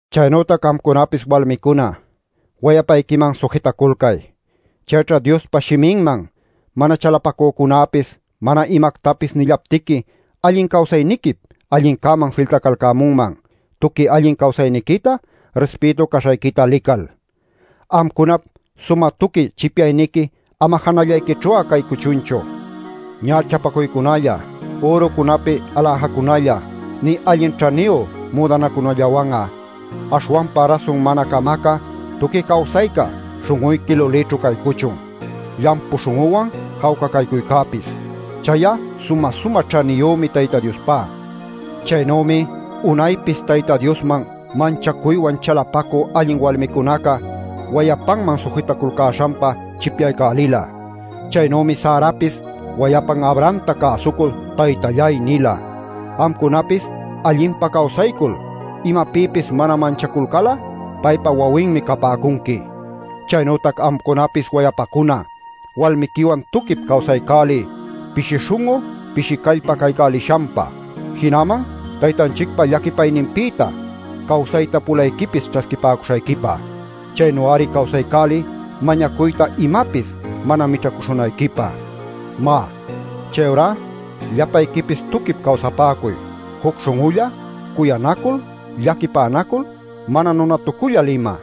Chaynütac amcunapis walmicuna, wayapayquiman sujitaculcay. Chayćha Diospa shiminman mana chalapacücunäpis mana imactapis nillaptiqui allin cawsayniquip allincäman filtacalcämunman, tuqui allin cawsayniquita, rispïtu caśhayquita lical. Amcunap sumä tuqui chipyayniqui ama janällayquićhu'a caycuchunchu: ñächapacuycunalla, ürucunapi aläjacunalla, nï allin ćhaniyu müdanacunallawan'a. Aśhwanpa rasun mana camacä tuqui cawsayca śhun'uyqui lulićhu caycuchun, llampu śhun'uwan jawca caycuycäpis. Chay'a sumä-sumä ćhaniyümi Tayta Diospá. Chaynümi unaypis Tayta Diosman manchacuywan chalapacü allin walmicunaca wayapanman sujitaculcäśhanpa chipyaycälila. Chaynümi Sarapis wayapan Abrahamta cäsucul “taytalláy” nila. Amcunapis allinpa cawsaycul imapïpis mana manchaculcal'a paypa wawinmi capäcunqui. Chaynütac amcunapis wayapacuna, walmiquiwan tuquip cawsaycäliy pishi śhun'u pishi callpa caycälishanpa jinaman Taytanchicpa llaquipayninpïta cawsayta pulayquipis ćhasquipäcuśhayquipa. Chaynu-ari cawsaycäliy mañacuyta imapis mana mićhacuśhunayquipä. Má, chayurá llapayquipis tuquip cawsapäcuy, juc śhun'ulla, cuyanacul, llaquipänacul, mana nunatucullal ima.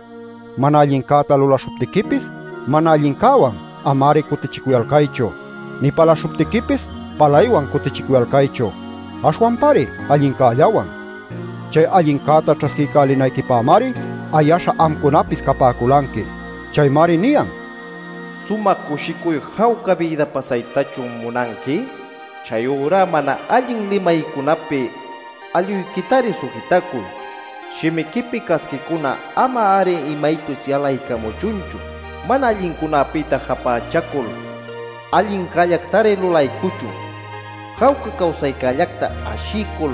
Mana allincäta lulaśhuptiquipis mana allincäwan ama-ari cutichicuyalcaychu, nï palaśhuptiquipis palaywan cutichicuyalcaychu, aśhwanpari allincällawan. Chay allincäta ćhasquiycälinayquipämari ayaśha amcunapis capäculanqui. Chaymari niyan: “¿Sumä cushicuy jawca bïda pasaytachun munanqui? Chayurá mana allin limaycunäpi alluyquitari sujitacuy. Shimiquipi casquicuna ama-ari imaypis yalaycamuchunchu. Mana allincunäpïta japächacul allincällactari lulaycuchun. Jawca cawsaycällacta ashiycul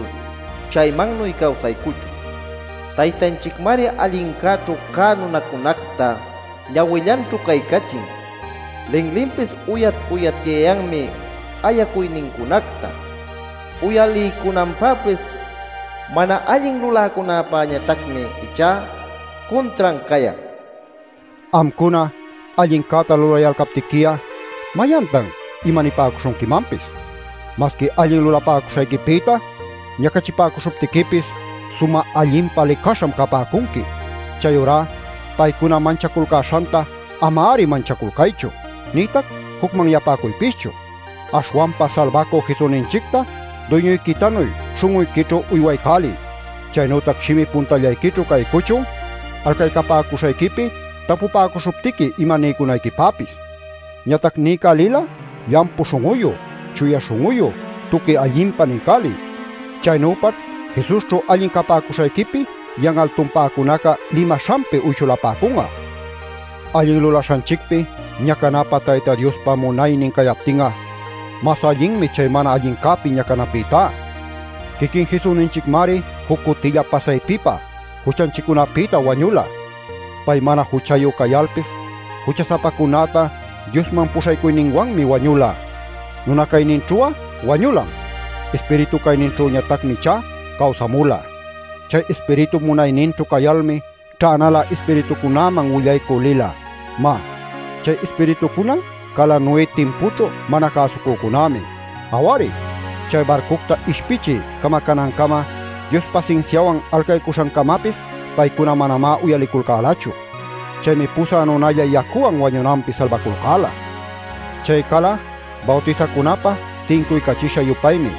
chaymannuy cawsaycuchun. Taytanchicmari allincäćhu cä nunancunacta ñawillanćhu caycachin; linlinpis uyat-uyatyayanmi ayacuynincunacta uyaliycunanpäpis. Mana allin luläcunäpäñatacmi ichá cuntran cayan” nil. Amcuna allincäta lulayalcaptiqui'a ¿mayantan imanapäcuśhunquimanpis? Masqui allin lulapäcuśhayquipïta ñacachipäcuśhuptiquipis ¡sumä allinpa licaśham capäcunqui! Chayurá paycuna manchaculcäśhanta ama-ari manchaculcaychu, nïtac jucmanyapäcuypischu. Aśhwanpa Salbacü Jesusninchicta Duyñuyquitanuy śhun'uyquićhu uywaycäliy. Chaynütac shimi puntallayquićhu caycuchun alcaycapäcuśhayquipi tapupäcuśhuptiqui ima niycunayquipäpis. Ñatac niycälil'a llampu śhun'uyu, chuya śhun'uyu, tuqui allinpa niycäliy. Chaynüpaćh Jesusćhu allin capäcuśhayquipi yan'al tumpäcunaca limaśhanpi uyshulapäcun'a. Allin lulaśhanchicpi ñacanapä Tayta Diospa munaynin cayaptin'a, mas allinmi chay mana allincäpi ñacanapïtá. Quiquin Jesusninchicmari juc cutilla pasaypipa juchanchiccunapïta wañula; Pay mana juchayu cayalpis jucha-sapacunäta Diosman puśhaycuyninwanmi wañula. Nuna cayninćhu'a wañulam; ispiritu cayninćhüñatacmi ichá cawsamula. Chay Ispiritup munayninćhu cayalmi ćhänalä ispiritucunäman willaycü lila. (Má, chay ispiritucuna cala Noé timpućhu mana cäsucücunämi. Aw-ari, chay barcucta ishpichiy camacänancama Dios pasinsiawan alcaycuśhancamapis paycuna manamá uyaliculcälachu. Chaymi pusä nunalla yacuwan wañunanpi salbaculcäla. Chay cala bawtisacunapä tincuycachisha-yupaymi.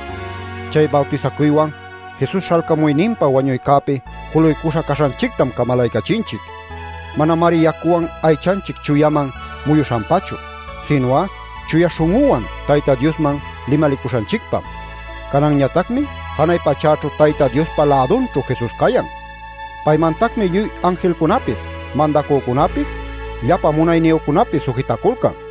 Chay bawtisacuywan Jesus śhalcamuyninpa wañuycäpi juluycuśha caśhanchictam camalaycachinchic. Manamari yacuwan aychanchic chuyaman muyuśhanpachu, sinu'a chuya śhun'uwan Tayta Diosman limalicuśhanchicpam.) Cananñatacmi janay pachäćhu Tayta Diospa lädunćhu Jesus cayan. Paymantacmi lluy anjilcunapis, mandacücunapis, llapa munayniyücunapis sujitaculcan.